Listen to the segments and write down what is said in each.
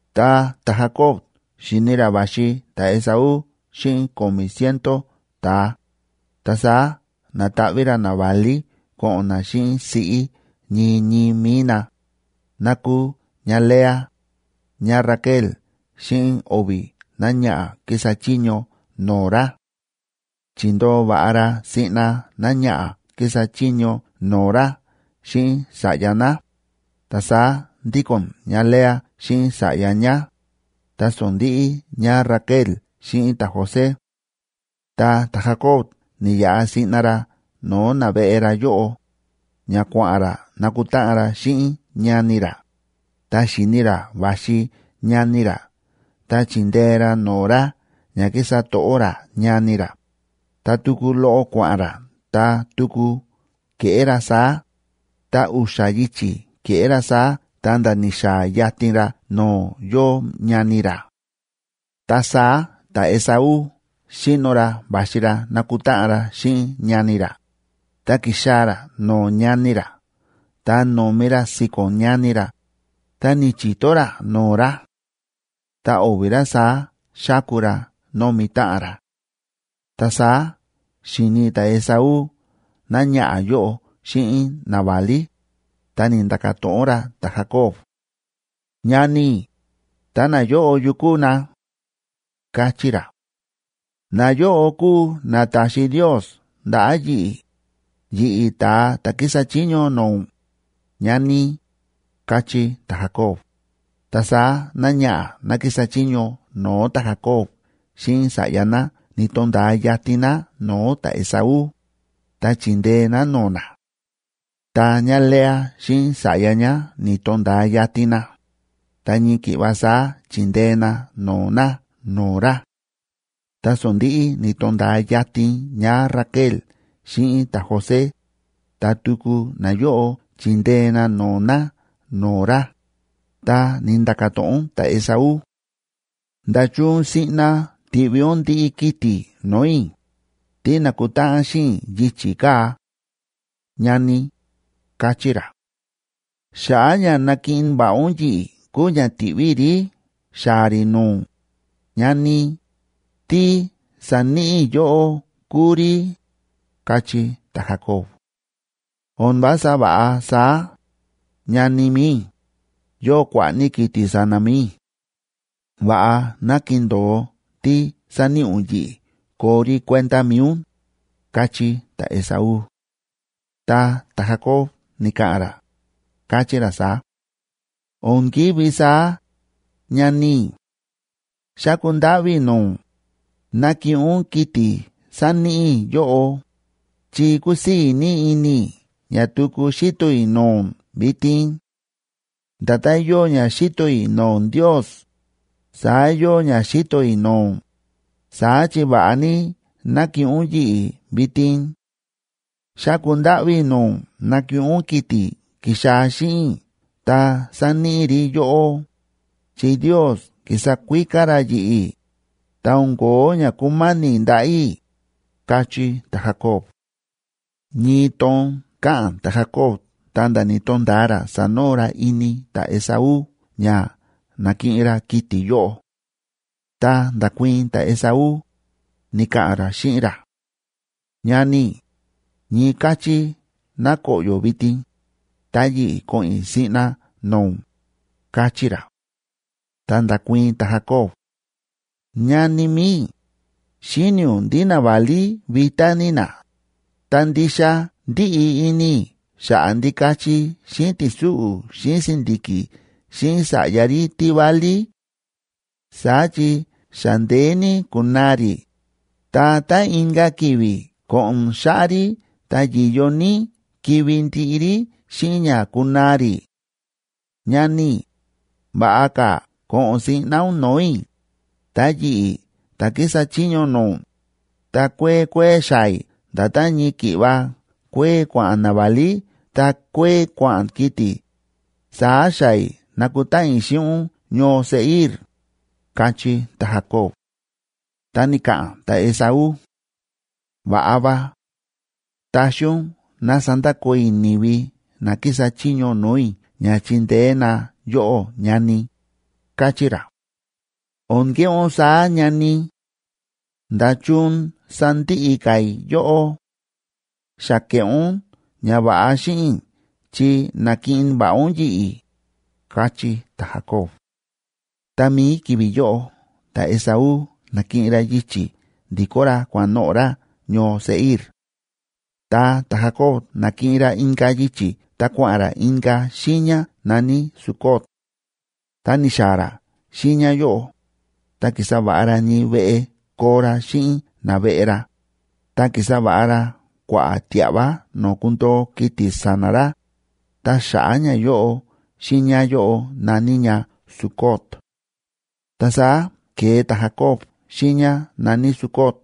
Tá ta̱Jacob xi̱ni ra va̱xi ta̱Esaú xíꞌin ko̱mi̱ ciento ta̱a, ta saá na̱taꞌví ra naválí ko̱ꞌo̱n na xíꞌin siꞌí ñii ñii mi̱i na, ná kúu ñáLea, ñáRaquel xíꞌin o̱vi̱ náñaꞌa̱ kísa chiño no̱o̱ ra. Chi̱ndoo va̱ꞌa ra siꞌna náñaꞌa̱ kísa chiño no̱o̱ ra xíꞌin sa̱ꞌya ná, ta saá ndíko̱n ñáLea xíꞌin sa̱ꞌya ñá, ta sondi̱ꞌi ñáRaquel xíꞌin ta̱José. Ta ta̱Jacob ni̱yaꞌa siꞌna ra no̱o̱ naveꞌe ra yóꞌo, ña kua̱ꞌa̱n ra nakutáꞌan ra xíꞌin ñani ra, ta xi̱ni ra va̱xi ñani ra ta chi̱ndee ra no̱o̱ ra ña kísa to̱ꞌó ra ñani ra, ta tuku loꞌo kua̱ꞌa̱n ra ta tuku ke̱ꞌé ra saá, ta u̱xa̱ yichi̱ ke̱ꞌé ra saá ta̱nda̱ ni̱xaa̱ yatin ra no̱o̱ yóo ñani ra. Ta saá ta̱Esaú xíno ra va̱xi ra nakutáꞌan ra xíꞌin ñani ra, ta ki̱xaa̱ ra no̱o̱ ñani ra ta no̱mi ra si̱ko̱n ñani ra, ta ni̱chi̱to ra no̱o̱ ra. Ta o̱vi̱ ra saá xáku ra nómi táꞌan ra. Ta saá xi̱ni ta̱Esaú náñaꞌa̱ yóꞌo xíꞌin naválí, ta ni̱nda̱ka̱ to̱ꞌon ra ta̱Jacob: ―Ñani i̱, ta nayóꞌo, ¿yukú na? ―káchí ra. ―Nayóꞌo kúu na ta̱xi Ndios ndaꞌa̱ yi̱ꞌi̱, yi̱ꞌi̱ ta̱a ta̱ kísa chiño no̱o̱ ún, ñani i̱ ―káchí ta̱Jacob. Ta saá náñaꞌa̱ ná kísa chiño no̱o̱ ta̱Jacob xíꞌin sa̱ꞌya ná ni̱to̱nda̱a yatin na no̱o̱ ta̱Esaú, ta chi̱ndee na no̱o̱ na. Ta ñáLea xíꞌin sa̱ꞌya ñá ni̱to̱nda̱a yatin na, ta ñii ki̱ꞌva saá chi̱ndee na no̱o̱ na no̱o̱ ra. Ta sondi̱ꞌi ni̱to̱nda̱a yatin ñáRaquel xíꞌin ta̱José, ta tuku nayóꞌo chi̱ndee na no̱o̱ na no̱o̱ ra. Ta ni̱nda̱ka̱ to̱ꞌon ta̱Esaú: ―¿Nda̱chun siꞌna ti̱ꞌví ún ndiꞌi kiti̱ no̱o̱ i̱, tí na̱kutáꞌan xíꞌin i̱ yichi̱ kaa̱?, ñani i̱ ―káchí ra. ―Xa̱ꞌa̱ ña nakiꞌin va̱ꞌa ún yi̱ꞌi̱ kúu ña ti̱ꞌví i̱ rí xaa̱ rí no̱o̱ ún, ñani i̱, tí sa̱níꞌi i̱ yóꞌó kúu rí ―káchí ta̱Jacob. ―O̱n vása va̱ꞌa saá, ñani mi̱i i̱, yóo kua̱ꞌa̱ ní kiti̱ sa̱na̱ mi̱i i̱. Va̱ꞌa ná kindo̱o tí sáníꞌi ún yi̱ꞌi̱ koo rí kuenda mi̱i ún ―káchí ta̱Esaú. Ta ta̱Jacob ni̱ka̱ꞌa̱n ra, káchí ra saá: ―O̱n ki̱ví saá, ñani i̱. Xáku ndáꞌví i̱ no̱o̱ ún, nakiꞌin ún kiti̱ sáníꞌi i̱ yóꞌó, chi kúsii̱ ní ini i̱ ña tuku xíto i̱ no̱o̱ ún vitin; nda̱tán yóo ña xíto i̱ no̱o̱ Ndios, saá yóo ña xíto i̱ no̱o̱ ún, saá chi va̱ꞌa ní nákiꞌin ún yi̱ꞌi̱ vitin. Xáku ndáꞌví i̱ no̱o̱ ún nakiꞌin ún kiti̱ ki̱xaa̱ xíꞌin i̱ ta sáníꞌi i̱ rí yóꞌó, chi Ndios ki̱sa kuíká ra yi̱ꞌi̱, ta o̱n ko̱ó ña kúmáni̱ ndaꞌa̱ i̱ ―káchí ta̱Jacob. Ñii toon káꞌa̱n ta̱Jacob ta̱nda̱ ni̱to̱nda̱a ra sa̱noo ra ini ta̱Esaú ña na̱kiꞌin ra kiti̱ yóꞌo. Ta nda̱kuii̱n ta̱Esaú, ni̱ka̱ꞌa̱n ra xíꞌin ra: ―Ñani i̱, ñii káchí ná koꞌyo̱ vitin, ta yi̱ꞌi̱ ko̱ꞌo̱n i̱ siꞌna no̱o̱ ún ―káchí ra. Ta nda̱kuii̱n ta̱Jacob: ―Ñani mi̱i i̱, xíni̱ ún ndí naválí vitá ní na, ta ndixa ndíꞌi ini i̱ xa̱ꞌa̱ ndikachi xíꞌin ti̱súꞌu̱ xíꞌin si̱ndi̱ki̱ xíꞌin sa̱ꞌya rí tí válí; saá chi xa ndeé ní ku̱naa rí, ta tá inka̱ ki̱vi̱ ko̱ꞌo̱n xáꞌá rí ta yi̱yo ní kivi̱ ndiꞌi rí xíꞌin ña kunaa rí. Ñani i̱, va̱ꞌa ka̱ ko̱ꞌo̱n siꞌna ún no̱o̱ i̱, ta yi̱ꞌi̱ ta̱ kísa chiño no̱o̱ ún, ta kuee kuee xaa̱ i̱ nda̱tán ñii ki̱ꞌva kuee kua̱ꞌa̱n naválí ta kuee kua̱ꞌa̱n kiti̱, saá xaa̱ i̱ nakutáꞌan i̱ xíꞌin ún ñoo Seir ―káchí ta̱Jacob. Ta ni̱ka̱ꞌa̱n ta̱Esaú: ―Va̱ꞌa va. Taxi ún ná sandakoo i̱ ni̱vi na kísa chiño no̱o̱ i̱ ña chindeé na yóꞌó, ñani i̱ ―káchí ra. ―O̱n keꞌé ún saá, ñani i̱. ¿Nda̱chun sandiꞌi ka̱ i̱ yóꞌó? Xa ke̱ꞌé ún ñava̱ꞌa xíꞌin i̱ chi na̱kiꞌin va̱ꞌa ún yi̱ꞌi̱ ―káchí ta̱Jacob. Tá mií ki̱vi̱ yóꞌo ta̱Esaú na̱kiꞌin ra yichi̱ ndi̱kó ra kua̱ꞌa̱n noꞌo̱ ra ñoo Seir. Ta ta̱Jacob na̱kiꞌin ra inka̱ yichi̱ ta kua̱ꞌa̱n ra inka̱ xiiña na̱ní Sucot.a Tá ni̱xaa̱ ra xiiña yóꞌo, ta ki̱sa va̱ꞌa ra ñii veꞌe koo ra xíꞌin naveꞌe ra, ta ki̱sa va̱ꞌa ra kua̱ꞌa̱ tia̱ꞌva no̱o̱ kundo̱o kiti̱ sa̱na̱ ra, ta xa̱ꞌa̱ ñayóꞌo xiiña yóꞌo na̱ní ña Sucot. Ta saá ke̱e ta̱Jacob xiiña na̱ní Sucot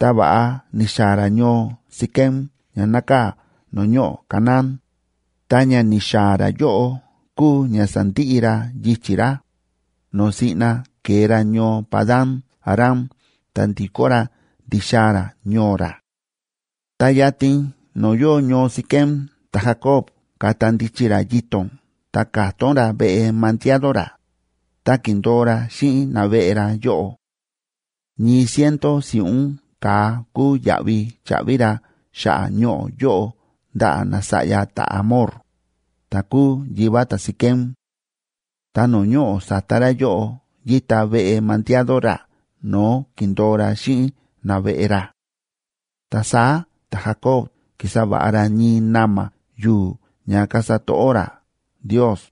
ta va̱ꞌa ni̱xaa̱ ra ñoo Siquem ña nákaa̱ no̱o̱ ñoꞌo̱ Canaán, ta ña ni̱xaa̱ ra yóꞌo kúu ña sa̱ndiꞌi ra yichi̱ ra, no̱o̱ siꞌna ke̱e ra ñoo Padan‑aram ta ndi̱kó ra ndi̱xaa̱ ra ñoo ra. Ta yatin no̱o̱ yóo ñoo Siquem ta̱Jacob ka̱ta ndichi ra yito̱n ta ka̱tón ra veꞌe mandiado ra, ta ki̱ndo̱o ra xíꞌin naveꞌe ra yóꞌo. Ñii ciento si̱ꞌún ka̱a kúu yaꞌvi cha̱ꞌvi ra xa̱ꞌa̱ ñoꞌo̱ yóꞌo ndaꞌa̱ nasa̱ꞌya ta̱Hamor, ta̱ kúu yivá ta̱Siquem. Ta no̱o̱ ñoꞌo̱ sa̱ta ra yóꞌo yíta veꞌe mandiado ra no̱o̱ ki̱ndo̱o ra xíꞌin naveꞌe ra. Ta saá ta̱Jacob ki̱sa va̱ꞌa ra ñii na̱ma̱ yu̱u̱ ña kasa to̱ꞌó ra Ndios,